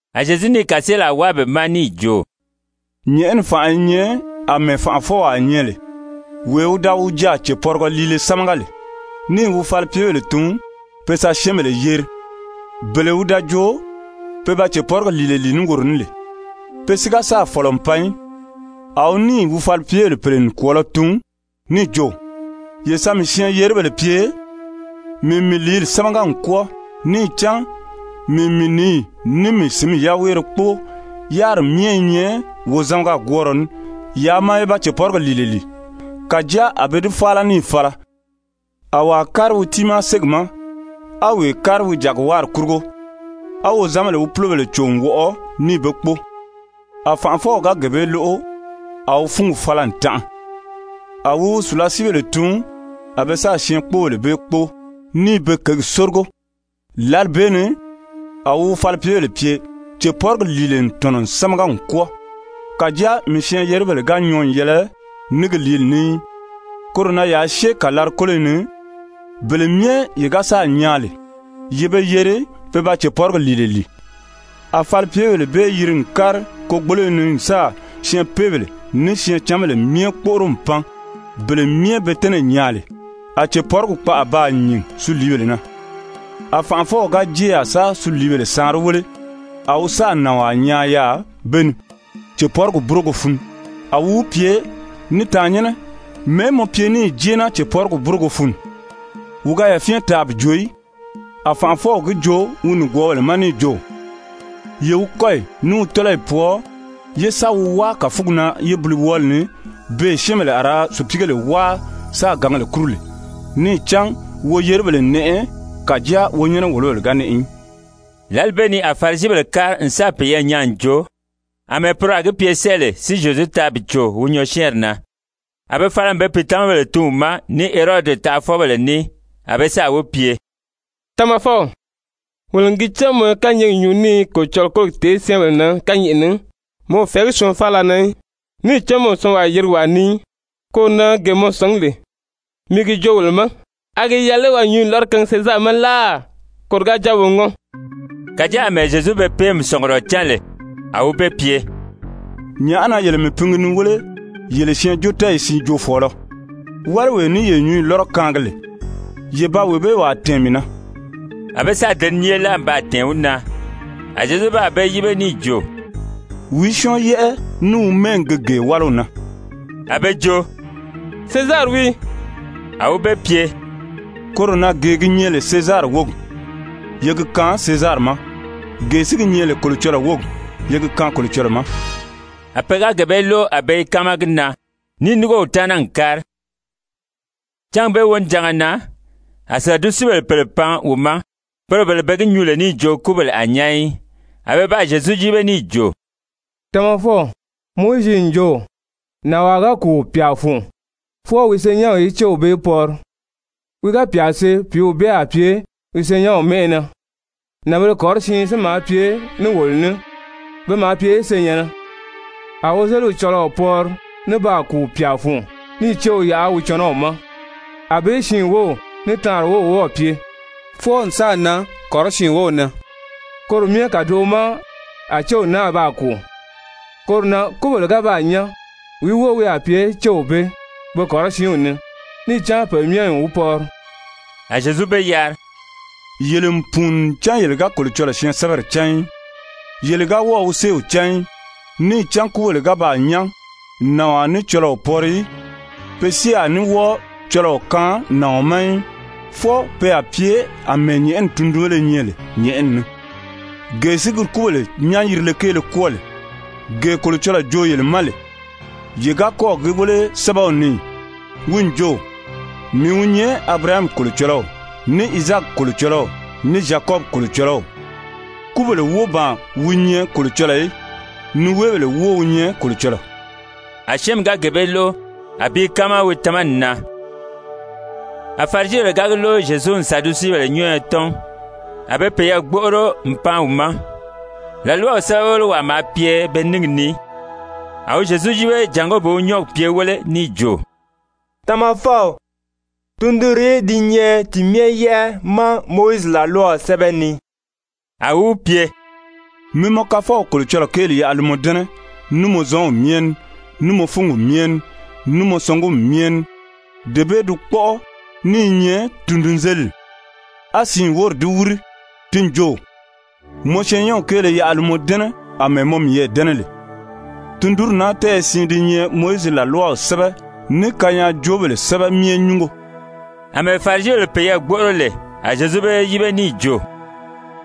A Zyezu níì kàseelaa wáa be ma níì jo: «Nyɛ̀ʔɛni fànʔa i nyɛ àmɛɛ fànʔafɔwaa nyɛ lè, wee wi da wi jaà cèpɔrigɔ liile sámaga lè, níì wi falipyebèle tun be sa syɛ́ɛnbèle yeri, bele wi da jo pe ba cèpɔrigi lìile lìi ní woro ní lè. Pe si ga sáà fɔ̀lɔ n pan í. A wi níì falipyebèle pèle nikwɔɔlɔ tun níì jo: ‹Ye sa mii syɛɛn-yeribèle pye, mii n mii lìíli sámaga n kwɔ́ɔ, níì cán mii n mii nǐyi ní mii sǐnmi yaweere kpóo, yáriri myɛ i nyɛ wozamaga-gwɔ́ɔrɔ ní, yaa maa ye ba cèpɔrigi lìile lìi.› Kàjáa a be di fáala níì fala, a wàa kári wi tiimaa ségi ma, a wee kári wi jàgiwáari kurugo. A wozanbèle wi púlobèle cò n wɔʔɔ níì be kpóo. A fànʔafɔw ga gee bee lóʔo, a wi fúngi fala n tanʔa. A wi wi sùlasiibèle tun a be sáà syɛɛnkpoobèle bee kpóo, níì be kěgi sórigo. Lǎli bee ni a wi wi falipyebèle pye: ‹Cèpɔrigi lìile n tɔ̀nɔ n sámaga n kwɔ́ɔ, kàjáa mii syɛɛn-yeribèle ga nyɔɔ n yɛlɛ ní gi lìíli ní í. Koro na yaa syée kàlari-kóloyi ni, bele myɛ ye ga sáà nyaa lè, ye be yeri pe ba cèpɔrigi lìile lìi.› A falipyebèle bee yiri n kári kogboloyi ni n sáà syɛɛnpeebèle ní syɛɛncanbèle myɛ kpóʔoro n pan, bele myɛ be tɛ́nɛ̀ nyaa lè, a cèpɔrigi kpaʔa baa nyìn suliibèle na. A fànʔafɔw ga jée yaà sa suliibèle saanri wéle, a wi sáà nànwaa nyaa yaà be ni, cèpɔrigi búrogo fun. A wi wi pye: ‹Ní tàannyɛnnɛ, mɛ̀ɛ́ mɔ pye níì jée naa cèpɔrigi búrogo fun?› Wi ga yafyɛn taa bi joo í. A fànʔafɔw gi joo wi nìgwɔɔbèle ma níì jo: ‹Ye wi kɔ́yi ní wi tɔ́lɔyi pwɔɔ, ye sa wi wáa kàfugi na yébiliwɔɔli ni, beè syɛ́ɛnbèle a ra sùpiigèle wáa sáā gǎngèle kúru lè.› Níì cán woyeribèle n nɛʔɛ, kàjáa wonyɛnɛ-wòlobèle ga nɛʔɛ í.» Lǎli bee ni a Farisibèle kári n sáà peyɛɛ nyaa n joo àmɛɛ poro a gi pye sɛ́ɛ lè si Zyezu taa bi cò wi nyɔɔsyɛɛnri na. A be fala n be pìitamabèle tun wi ma ní Herodi taʔafɔbèle ní, a be sáà wi pye: «Tamafɔw, wolo n gi cán mɔ i kányɛɛgi nyuu ní i Kolocɔlɔɔ kólogi tèé syɛ́ɛnbèle na kányɛʔɛ ni, mɔ o fɛ̀ɛgí syɔɔn faala na í. Níì cán mɔ o syɔɔnwaa yirigi wàa ni í. Koro na gee mɔ sɔ̀ngí lè, mi gi joo wolo ma, a gi yɛlɛ lé waa nyǔnyi lɔ́rɔ kaangi Sezari ma láà, koro ga jáa wo ŋɔ́n?» Kàjáa àmɛɛ Zyezu be péemi sɔ̀ngurɔ cán lè, a wi be pye: «Nyàʔá na yele mii pingi ni wéle yele syɛɛnjóotɛɛyi siin joofɔɔlɔ? Wáliwee ní ye nyǔnyi lɔ́rɔ kaangi lè, ye ba wee bee wàa tɛ̀ɛn mii na.» A be sáà deniye láa n baa tɛ̀ɛn wi na. A Zyezu baa be yíbe níì jo: «Wìí syɔ́ɔn yɛ́ʔɛ ní wi mɛ́ɛgi gi gee wáliw na?» A be jo: «Sezari wii.» A wi be pye: «Koro na gee gi nyɛ lè Sezari wógi, ye gi kaan Sezari ma. Gee si gi nyɛ lè Kolocɔlɔɔ wógi, ye gi kaan Kolocɔlɔɔ ma.» A pe ga gee bee lóʔo a be i káama gi na, níì núngo wi taana n kári. Cángi bee wonijanga na, a Sadusebèle pèle pan wi ma, poro bele be gi nyuu lè níì jo kúbèle a nyán í. A be baa Zyezu yíbe níì jo: «Tamafɔw, Mowizi n jo: Nànwaa ga kùu pyà fun, fwɔɔ wi senyɛnw í wi céw pɔri, wi ga pyà see, pìíw bee a pye wi senyɛnw mɛ́ʔɛ na. Nànbēle kɔrɔsiin si maa pye ní wolo ní, pe maa pye senyɛ̀nnɛ. A wozeliw cɔlɔɔ pɔri ní baa kùu pyà fun níì céw yaʔa wi cɔnɔw ma. Anbée siin wów ní taanri wów wɔ́ɔ̀ pye fwɔɔ n sáà nan kɔrɔsiin wów na. Koro myɛ kàdoʔo ma, a céw náa baa kùu. Koro na kúbèle ga baa nyán, wìí wóo wi a pye céw bee be kɔrɔsiinw ni, níì cán pe myɛ n wi pɔri?» A Zyezu be yari: «Yele n pùuni ncan yele ga Kolocɔlɔɔ syɛɛnsɛbɛri cán í. Yele ga wɔ́ɔ̀ wi séew cán í. Níì cán kúbèle ga baa nyán, nàɔn a ní cɔlɔɔ pɔri í, pe si a ní wɔ́ɔ cɔlɔɔ kaan nàɔn ma í, fwɔɔ pe a pye àmɛɛ nyɛ̀ʔɛni tundunbéle nyɛ lè nyɛ̀ʔɛni ni. Gee si gi kúbèle nyán-yirile kéele kwɔ́ɔ lè, gee Kolocɔlɔɔ joo yele ma lè, yele ga kɔ́ɔ̀ gi wéle sɛ́bɛw ni ì? Wi n jo: ‹Mii wi nyɛ Abirahami Kolocɔlɔw, ní Izaaki Kolocɔlɔw, ní Zyakɔbi Kolocɔlɔw.› Kúbèle wóo ban wi nyɛ Kolocɔlɔɔ í, niweebèle wóo wi nyɛ Kolocɔlɔɔ.» A syɛ́ɛnmi ga gee bee lóʔo, a bi i káama wi tamani na. A Farisibèle ga gi lóʔo Zyezu n Sadusebèle nyɔ́ɔyɔ tɔ́n, a be peyɛɛ gbóʔoro n pan wi ma. làlwaw sɛ́bɛwelewaa maa pye be níngi ni, a wi Zyezu yíbe jàngó bi wi nyɔ́ɔgi pye wéle níì jo: «Tamafɔw, tundunrìí di nyɛ ti myɛ yɛ́ʔɛ ma Mowizi làlwaw sɛ́bɛ ni?» A wi wi pye: « ‹Mi mɔ Kafɔw Kolocɔlɔɔ kéeli yaʔa li mɔ dɛ́nɛ ní mɔ zɔnw myɛ ní, ní mɔ fúngi myɛ ní, ní mɔ sɔngumi myɛ ní.› Dee bee di kpɔ́ʔɔ ní i nyɛ tundunzelidi. A siin wóri di wíri. Ti n jo: ‹Mɔ syɛɛnnyɛnw kéele yaʔa li mɔ dɛ́nɛ àmɛɛ mɔ miyɛɛ dɛ́nɛ lè.› Tundunri naa tɛ́ɛyɛ siin di nyɛ Mowizi làlwaw sɛ́bɛ ní kanyaajoobèle sɛ́bɛ myɛ nyúngo.» Amɛɛ Farisibèle peyɛɛ gbóʔoro lè, a Zyezu be yíbe níì jo: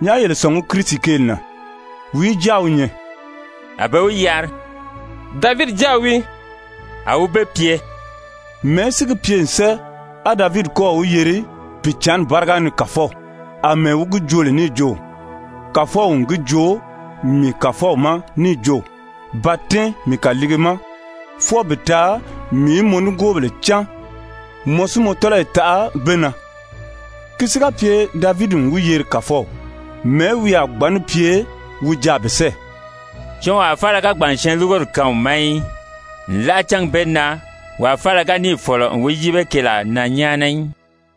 «Nyàʔá yele sɔ̀ngí Kirisi kéeli na? Wìí jáa wi nyɛ?» A be wi yari: «Davidi jáa wii.» A wi be pye: «Mɛ̀ɛ́ si gi pye n sɛ́ɛ, á Davidi kɔ́ɔ̀ wi yeri Pìicǎnni báriga ni Kàfɔw, àmɛɛ wi gi joo lè níì jo: ‹Kàfɔw n gi joo mii Kàfɔw ma níì jo: Ba tɛ́ɛn mii kàliige ma fwɔɔ bi taa mii í mɔ nigoobèle cáan, mɔ si mɔ tɔ́lɔyi taʔa be na?› Ki si ga pye Davidi n wi yeri Kàfɔw, mɛ̀ɛ́ wi a gbǎn ní pye wi jaà bi sɛ́ɛ?» Syɔɔnwaa faala ga gbàn n syɛɛnlurugori kaan wi ma í. Nlaʔa cángi bee na wàa faala ga níì fɔ̀lɔ n wi yíbe keelaa na nyáana í.